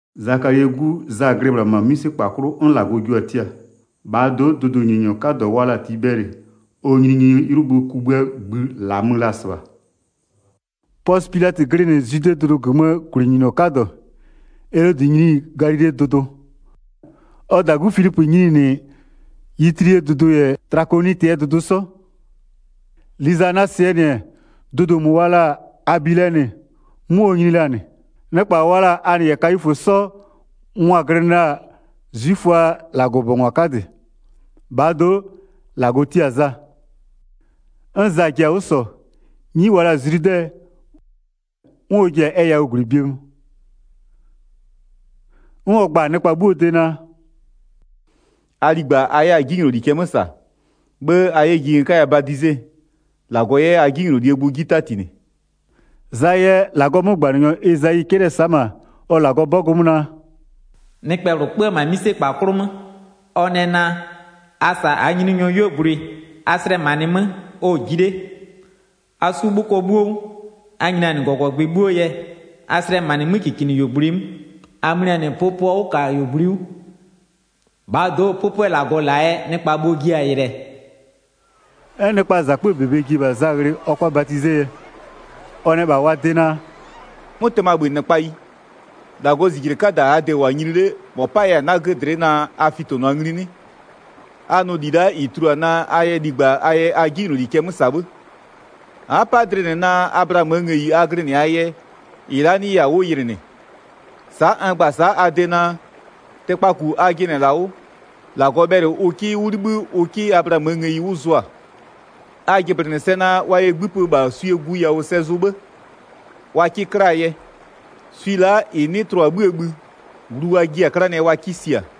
Zakalie 'gu Za glɩ -bhla -ma 'mïsekpa 'klʋ 'n -Lagɔ jio-a tia. -Bhaa do'o, dʋdʋnyininyɔ 'kadɔ wa la-a Tibɛlɩ, ɔ nyininyiniee 'ylʋbö kugbïa -ngbï -la mö la-a -sɩbha. Pɔsɩ Pilatɩ glɩnɩ Zwidee dʋdʋ -gömöö -gwlɩnyininyɔ 'kadɔ, Elodɩ nyini Galilee dʋdʋ, ɔ -dagu Filipö nyini -nɩ Yitilee dʋdʋ -yɛ Tlakonɩtɩɛ dʋdʋ 'sɔ. Lizaniasɩɛ -nɩ-ɛ, dʋdʋ -mʋ wa la-a Abilɛnɩ, 'mʋ ɔ nyini la-a -nɩ. Nɩkpa wa la-a Anɩ -yɛ Kayifö 'sɔ mʋa-a glɩnɩ la-a 'zwiföaa -Lagɔbʋbɔngwa 'kadɩ. -Bhaa do'o -Lagɔ tia-a Za. 'N Za ji-a 'wʋ -sɔ, 'nyi wa la-a Zludɛ, 'n ɔ ji-a ɛ yawʋɔ -gwlɩ bie mö. 'N ɔ gba-a -bha nɩkpa 'bhuoo de naa: “A ligba a 'yɛ a 'jinyloli cɛ 'mö -sa. 'Bhë a 'yɛ ji n 'kaya badize, -Lagɔ 'yɛ a 'jinylolie gbʋ 'ji 'tatinɩ.” Zaa yɛ -Lagɔɔ 'mögbanɩnyɔ Ezayi 'cɛlɩ-ɛ sa'a -ma ɔ -Lagɔbɔgʋ 'mö naa: “Nɩkpɛ -bhlʋ kpö-ö -ma 'mïsekpa 'klʋ 'mö, ɔ nɛ naa: A -sa -aa Nyininyɔɔ 'yuogblʋɩ, a slɛmanɩɩ 'mö ɔ-ɔ ji 'le. A 'su 'bhʋkɔ 'bhuo 'wʋ, a nyinianɩ -gɔgɔgbɩ 'bhuo yɛ, a slɛmanɩ 'mökikinɩyuogblʋɩ 'mö, a mlianɩ pʋpʋɔ 'wʋkayuogblʋɩ 'wʋ. 6-Bhaa do'o 'pʋpʋɛ -Lagɔ -la-a yɛ, nɩkpa bhuo-o jiɛ-a yɩlɩɛ.” 'N nɩkpaa -zakpöö -bebe ji-e -bha Za ghlɩ ɔ 'kʋa badizee yɛ. Ɔ nɛ -bha wa de naa: “'Mʋtɩmabhönɩkpayi, -Lagɔɔ -zijle 'kada -aa de-e -wʋ-a nyini 'le, -mɔ 'paya-a 'nagö dlɩ'ɩ naa a fitonʋa ngli 'nɩ? A nʋ -li la'a -ɩ tulua naa a yɛ ligba a yɛ a 'jinyloli cɛ 'mö -sa 'bhë. A'a 'pa dlɩ -nɩ naa Ablaamöö ngëyi a glɩnɩ-aa yɛ -ɩ la'a 'nɩya-a 'wʋ yɩlɩ -nɩ. Sa'a n gba-a sa'a a de naa: Tɩkpaku a jɩnɩ-ɛ -la 'wʋ, -Lagɔ bhɛlɩ ʋ 'kɩ 'wʋ 'libhï ʋ 'kɩ Ablaamöö ngëyi 'wʋ zʋa. A jɩblɩnɩ sɛ naa wa yɛ 'gbïpa -bha swie gu yawʋ sɛ zʋ 'bhë wa 'kɩ 'klaa yɛ, swi la'a -ɩ 'nɩ tlʋ-a 'bhïë bhï, glu wa jiɩ-a 'klanɩɛ wa 'kɩ sia.”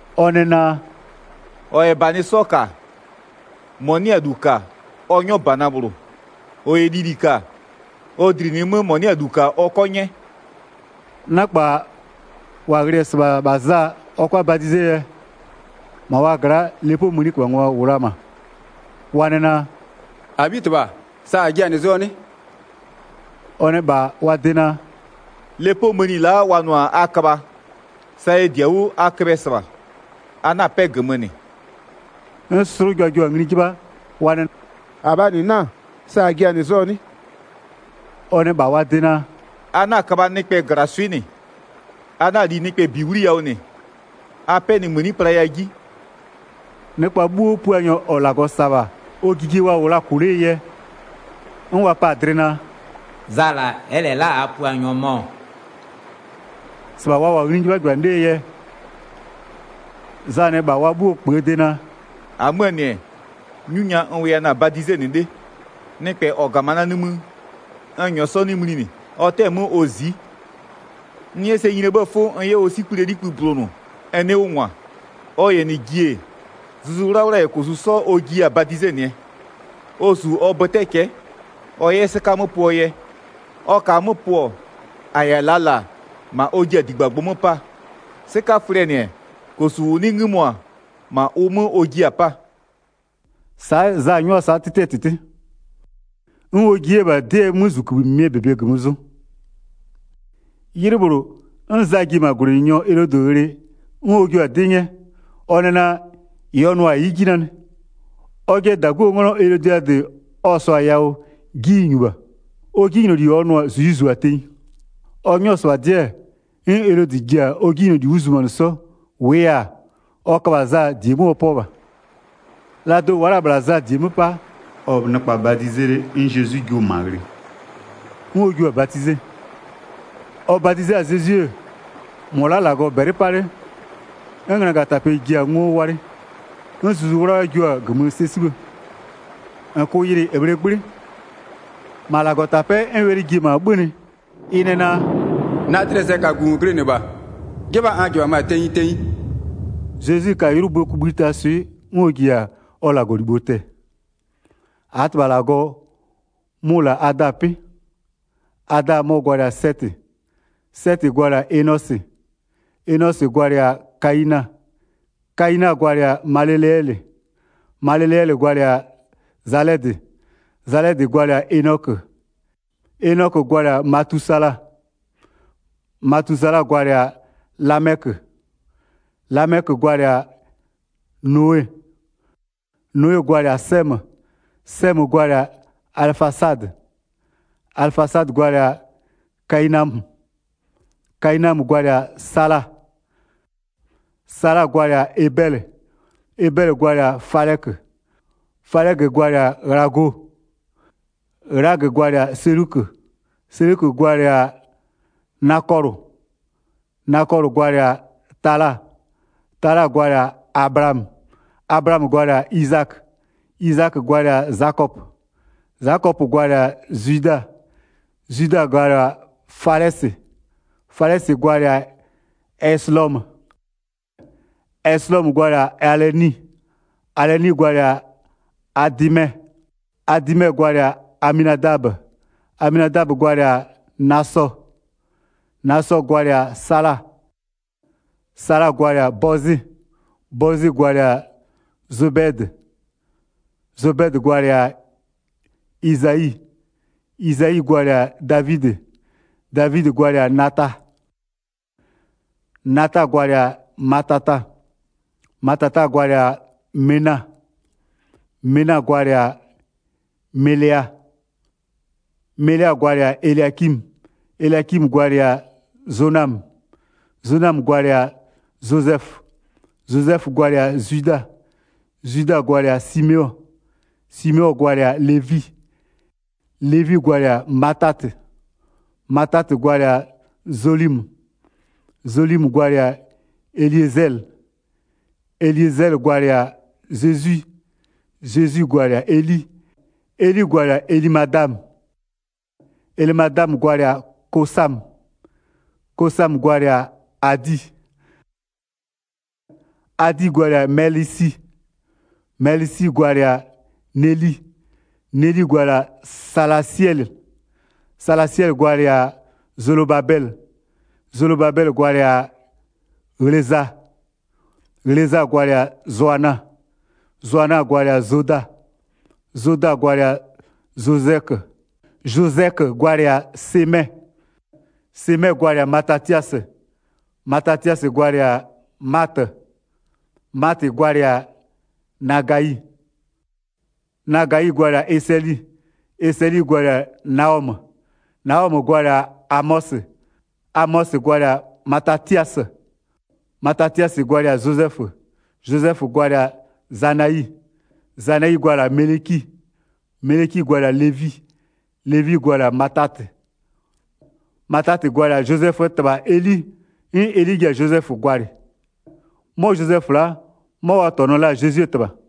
Ɔ nɛ naa: “-Ɔ -yɛ -banɩ 'sɔ -ka, -mɔ 'nɩ-a -lu -ka ɔ 'nyɔ -bana -bhlʋ. -Ɔ -yɛ lili -ka ɔ -dlinɩɩ 'mö -mɔ 'nɩ-a -lu -ka ɔ 'kɔ 'nyɛ.” Nɩkpa -wa ghlɩ-ɛ -sɩbha -bha Za ɔ 'kʋa badizee yɛ, -ma wa gla'aa lepoo mëniköbhangwa -wʋ la-a -ma, wa nɛ naa: “-Abhitɩbha, sa -a ji-a -nɩ zʋɔ 'nɩ?” Ɔ nɛ -bha wa de naa: “Lepoo mëni la'a wa nʋ-a a köbha, sa ɛ -di-a 'wʋ a köbhɛ -sɩbha. A 'na-a 'pɛ -gömö -nɩ.” 'N 'slʋja jio-a -nɩ ngli 'jɩbha, wa nɛ: “-Abhaa -nɩ 'na-a? Sa -a ji-a -nɩ zʋɔ nɩ?” Ɔ nɛ -bha wa de naa: “A 'na-a köbha nɩkpɛ -glaswɩ'ɩ -nɩ, a 'na-a li nɩkpɛ -bi 'wliyawʋ -nɩ, a 'pɛnɩmëni playa 'ji.” Nɩkpa 'bhuo, Puanyɔ -ɔ -Lagɔ -sa-a -bha ɔ jijie wa -wʋ la-a -kʋ 'lee yɛ, 'n wa pa-a dlɩ naa: “Za -la, ɛ'ɛ -lɛ la'a -aa Puanyɔ mɔ-ɔ?” 16-Sɩbha wa -wʋ-a ngli 'jɩbhajɩbhanɩ 'lee yɛ, Za nɛ -bha wa 'bhuo -kpöö de naa: “-Amöö -nɩ-ɛ, 'nyu nya n wʋya na-a badizenɩ 'le. Nɩkpɛ -ɔ -ga-a ma na nimï, n -nyɔɔ 'sɔ 'nɩ mlinɩ, ɔ 'tɛ-ɛ 'mö ɔ zi'i. N 'yɛ sɛ nyinie 'bhëë 'fʋ n 'yɛ ɔ 'sikplie 'likpï bulonʋ n 'nɩɩ 'wʋ -ngwa. Ɔ -yɛ -nɩ ji-e, Zuzu 'Wlawla -yɛ -kosu 'sɔ ɔ jiya-a badizenɩɛ. Ɔ -su ɔ bötɛ cɛ'ɛ ɔ 'yɛ 'sɩka 'mö pʋɔ yɛ, ɔ -kaa 'mö pʋ-ɔ, -a -yɛ-a -laa -la 'ma ɔ ji-a -digbagbʋ 'mö 'paa, 'sɩkaflɩɛ -nɩ-ɛ, -kosu -ʋ 'nɩ 'ngïmo-a -ma ʋ 'mö ɔ jiɩ-a 'paa.” Sa'a Za 'nyʋa-a sa'a 'tɩtɩɛ -tɩtɩ. 'N ɔ ji 'yɛ-a -bha 'dɩɛ 'mözʋkïbhï -mɩmɩɛ -bebe -gömö zʋ. 'Ylɩ -bhlʋ, 'n Za ji-e -ma -gwlɩnyininyɔ Elodɩ ghlɩ 'n ɔ jio-a 'dɩ 'nyɛ, ɔ nɛ naa: -Ɩ ɔ nʋ-a ɩ'ɩ 'ji nanɩ, ɔjɩɛ -daguo 'nglɔ Elodiadɩ ɔ -sɔɔ-a yawʋ 'ji ɩ -nyu -bha, ɔ 'jinyloli ɔ nʋ-a, -zu ɩ zu-a tenyi. Ɔ 'nyɔ-ɔ -sɩbha 'dɩ-ɛ, 'n Elodɩ ji-a ɔ 'jinyloli 'wʋ zumanɩ 'sɔ, -wʋʋ yɛ-a, ɔ köbha-a Za -die 'mö ɔ 'pɔ -bha. La do'o wa'a la-a -bhla Za -die 'mö 'pa, ɔ-ɔ nɩkpa badizee 'le 'n Zezwi jio-o -ma ghlɩ, 'n ɔ jio-a badize. Ɔ badize-a Zezwi, -mɔ la'a-a -Lagɔ -bɛlɩ 'pa 'le, 'n ngönagatapɛ ji-a ngo walɩ. 'N Zuzu 'Wlawla jio-a -gömö sɛ 'sibhë, -n -kʋʋ yɩlɩ e -bhlee 'gblɩ. -Ma -Lagɔtapɛ'ɛ 'n wɛlɩ ji-e -ma 'bhönɩ ɩ nɛ naa: “Na dlɩɛ sɛkagu -n glɩnɩ -bha, 'jɩbha n -jɩbhamö-a tenyi tenyi.” Zezwi ka 'ylʋböö kugbïtaa swɩ 'n ɔ ji-a ɔ -Lagɔlibho tɛ-ɛ. 24-38-Aa -tɩbha -Lagɔ mʋ-ʋ -la-a Adaa 'pɩ. Adaa mɔ-ɔ gwalɩ-a Sɛtɩ, Sɛtɩ gwalɩ-a Enosɩ, Enosɩ gwalɩ-a Kayina, Kayina gwalɩ-a Maleleɛlɩ, Maleleɛlɩ gwalɩ-a Zalɛdɩ, Zalɛdɩ gwalɩ-a Enɔkö, Enɔkö gwalɩ-a Matusala, Matusala gwalɩ-a Lamɛkö, Lamɛkö gwalɩ-a Nowe, Nowe gwalɩ-a Sɛmö, Sɛmö gwalɩ-a Alɩfasadɩ, Alɩfasadɩ gwalɩ-a Kayinamö, Kayinamö gwalɩ-a Sala, Sala gwalɩ-a Ebɛlɩ, Ebɛlɩ gwalɩ-a Falɛkö, Falɛkö gwalɩ-a Ghlago, Ghlago gwalɩ-a Selukö, Selukö gwalɩ-a Nakɔlʋ, Nakɔlʋ gwalɩ-a Tala, Tala gwalɩ-a Ablaamö, Ablaamö gwalɩ-a Izakö, Izakö gwalɩ-a Zakɔpö, Zakɔpö gwalɩ-a Zwida, Zwida gwalɩ-a Falɛsɩ, Falɛsɩ gwalɩ-a Eslɔmö, Eslɔmö gwalɩ-a Alɩni, Alɩni gwalɩ-a Adɩmɛ, Adɩmɛ gwalɩ-a Aminadabö, Aminadabö gwalɩ-a Nasɔ, Nasɔ gwalɩ-a Sala, Sala gwalɩ-a Bɔzɩ, Bɔzɩ gwalɩ-a Zobɛdɩ, Zobɛdɩ gwalɩ-a Izayi, Izayi gwalɩ-a Davidɩ, Davidɩ gwalɩ-a Nata, Nata gwalɩ-a Matata, Matata gwalɩ-a Mena, Mena gwalɩ-a Melea, Melea gwalɩ-a Eliakimö, Eliakimö gwalɩ-a Zonamö, Zonamö gwalɩ-a Zozɛfö, Zozɛfö gwalɩ-a Zwida, Zwida gwalɩ-a Simeɔ, Simeɔ gwalɩ-a Levi, Levi gwalɩ-a Matatɩ, Matatɩ gwalɩ-a Zolimö, Zolimö gwalɩ-a Eliezɛlɩ, Eliezɛlɩ gwalɩ-a Zezwi, Zezwi gwalɩ-a Eli, Eli gwalɩ-a Elɩmadamö, Elɩmadamö gwalɩ-a Kosamö, Kosamö gwalɩ-a Adi, Adi gwalɩ-a Mɛlɩsi, Mɛlɩsi gwalɩ-a Neli, Neli gwalɩ-a Salasɩɛlɩ, Salasɩɛlɩ gwalɩ-a Zolobabɛlɩ, Zolobabɛlɩ gwalɩ-a Ghleza, Ghleza gwalɩ-a Zoana, Zoana gwalɩ-a Zoda, Zoda gwalɩ-a Zozɛkö, Zozɛkö gwalɩ-a Semɛ, Semɛ gwalɩ-a Matatiasɩ, Matatiasɩ gwalɩ-a Matɩ, Matɩ gwalɩ-a Nagayi, Nagayi gwalɩ-a Esɩli, Esɩli gwalɩ-a Naɔmö, Naɔmö gwalɩ-a Amɔsɩ, Amɔsɩ gwalɩ-a Matatiasɩ, Matatiasɩ gwalɩ-a Zozɛfö, Zozɛfö gwalɩ-a Zanayi, Zanayi gwalɩ-a Mɛlɩki, Mɛlɩki gwalɩ-a Levi, Levi gwalɩ-a Matatɩ, Matatɩ gwalɩ-a Zozɛföö -tɩbha Eli 'n Eli ji-a Zozɛfö gwalɩ. 'Mɔ Zozɛfö la'a 'mɔ wa -tɔnʋ-ɔ la'a Zezwie -tɩbha.